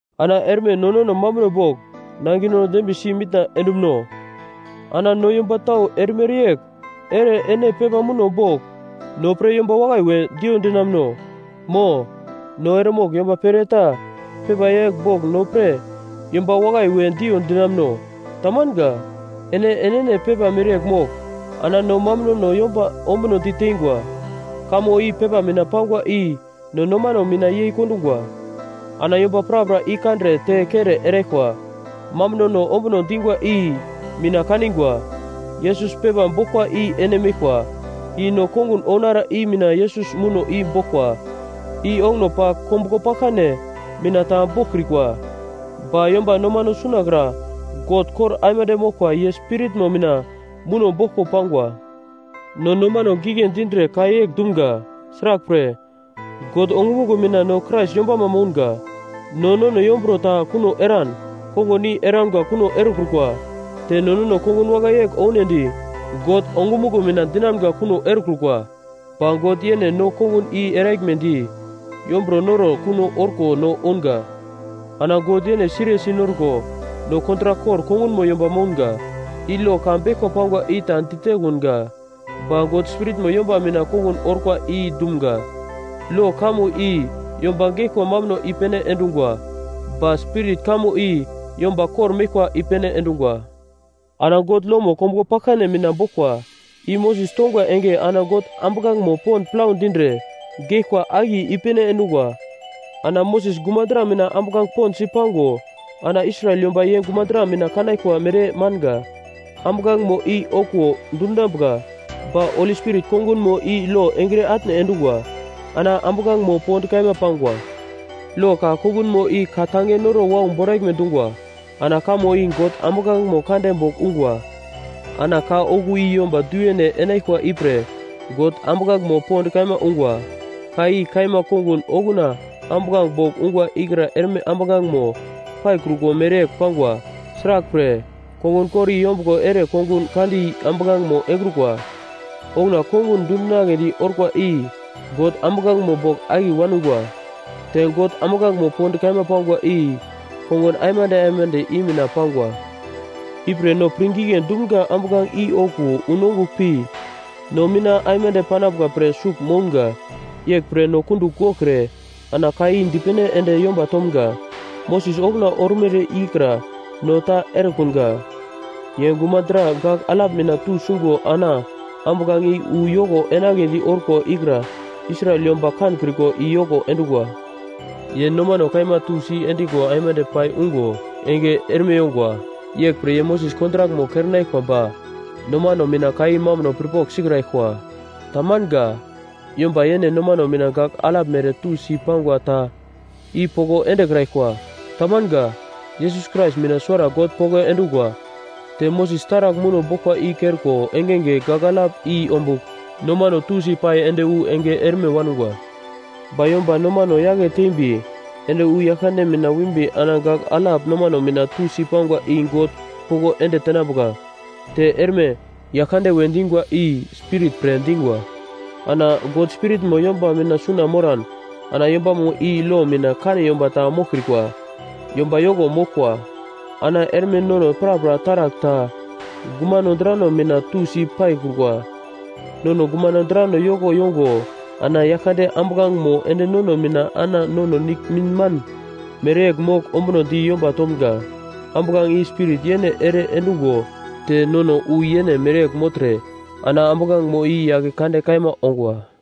Ana erme no nono mambuno bogl nangino dembiye si mitna endumuno? Ana no yomba tau erimere yegl ere ene pepa muno bogl no pre yomba wakai we diyo dinamuno? Mo, no eremogl yomba pere ta pepa yegl bogl no pre yomba wakai we diyo dinamuno? Tamanga. Ene enene pepa mereyegl mogl ana no mambunono yomba ombuno diteingwa. Kamo i pepa mina pangwa i no nomano mina yei kondungwa. Ana yomba prapra i kandre te kere eraglkwa. Mambunono ombuno dingwa i mina kaningwa, Yesus pepa boglkwa i ene meglkwa, i no kongun ounara i mina Yesus muno i boglkwa, i onguno pagl kombuglo paglkane mina ta boglkrikwa. Ba yomba nomano sunakra God kor aimande moglkwa ye Spiritmo mina muno boglko pangwa. No nomano pirngigle dindre ka yegl dumga; sraglpre, God ongumuglo mina no Krais yombama mounga. No nono yomburo ta kuno eran kongun i eramga kuno erekrukwa. Te no nono kongun wakai yegl ounedi God ongumuglo mina dinamgo kuno erekrukwa. Ba God yene no kongun i eraglmedi yomburo noro kuno orko no ounga. Ana God yene siriyesi norko no kontrak kor kongunmo yomba mounga. I lo ka beglkwa pangwa i ta ditekunga, ba God Spiritmo yomba mina kongun orkwa i dumga. Lo kamo i yomba geglkwa mambuno i-pene endungwa, ba Spirit kamo i yomba kor-meglkwa i-pene endungwa. Ana God lomo kombuglo paglkane mina boglkwa, i Moses tongwa enge ana God ambuglangemo pond plau dindre geglkwa akiye i-pene endungwa. Ana Moses gumadra mina ambuglange pond si pango ana Israel yomba ye gumadra mina kanaglkwa mere manga. Ambuglangemo i okuwo dundungwa. Ba Holi Spirit kongunmo i lo engre atne endungwa. Ana ambuglangemo pond kaima pangwa. Lo ka kongunmo i ka-tange noro wau boraglme dungwa. Ana kamo i God ambuglangemo kande bogl ungwa, ana ka okuwo i yomba du-yene enaglkwa ipre God ambuglangemo pond kaima ungwa. Ka i kaima kongun okuna ambuglange bogl ungwa ikra erme ambuglangemo paikrukwa mereyegl pangwa. Sraglpre, kongun kor i yombuglo ere kongun kandi ambuglangemo engrukwa. Okuna kongun dundinagledi orkwa i God ambuglangemo bogl akiye wangwa. Te God ambuglangemo pond kaima pangwa i kongun aimande aimande i mina pangwa. Ipre no pirngigle dumga ambuglange i okuwo unongugl pi no mina aimande panambuka pre sugl mounga. Yeglpre no kundugl goglkre ana ka i dipene ende yomba tomga. Moses okuna ormere ikra no ta erekunga. Ye gumadra gagl alap mina tusungo ana ambuglange i wu yoko enagledi orkwa ikra Israel yomba kankriko i yoko endungwa. Ye nomano kaima tusi endigo aimande pai ungo enge erme yongwa. Yeglpre ye Moses kontrakmo kerenaglkwa ba nomano mina ka i mambuno pirpogl sikraglkwa. Tamanga. Yomba yene nomano mina gagl alap mere tusi pangwa ta i poko endekraglkwa. Tamanga. Yesus Krais mina suwara God poko endungwa. Te Moses taragl muno boglkwa i kerko engenge gagl alap i ombugl nomano tusi pai ende wu enge erme wangwa. Ba yomba nomano yake tembi ende wu Yaglkande mina wimbi ana gagl alap nomano mina tusi pangwa i God poko ende tenambuka. Te erme, Yaglkande we dingwa i Spirit pre dingwa. Ana God Spiritmo yomba mina suna moran, ana yombamo i lo mina kane yomba ta moglkrikwa, yomba yoko moglkwa. Ana erme nono prapra taragl ta gumano drano mina tusi paikrukwa. Nono gumano drano yoko yongo ana Yaglkande ambuglangemo ende nono mina ana nono nigl minman mereyegl mogl ombunodi yomba tomga, ambuglange i Spirit yene ere endungo te nono wu yene mereyegl mogltre ana ambuglangemo i yake kande kaima ongwa.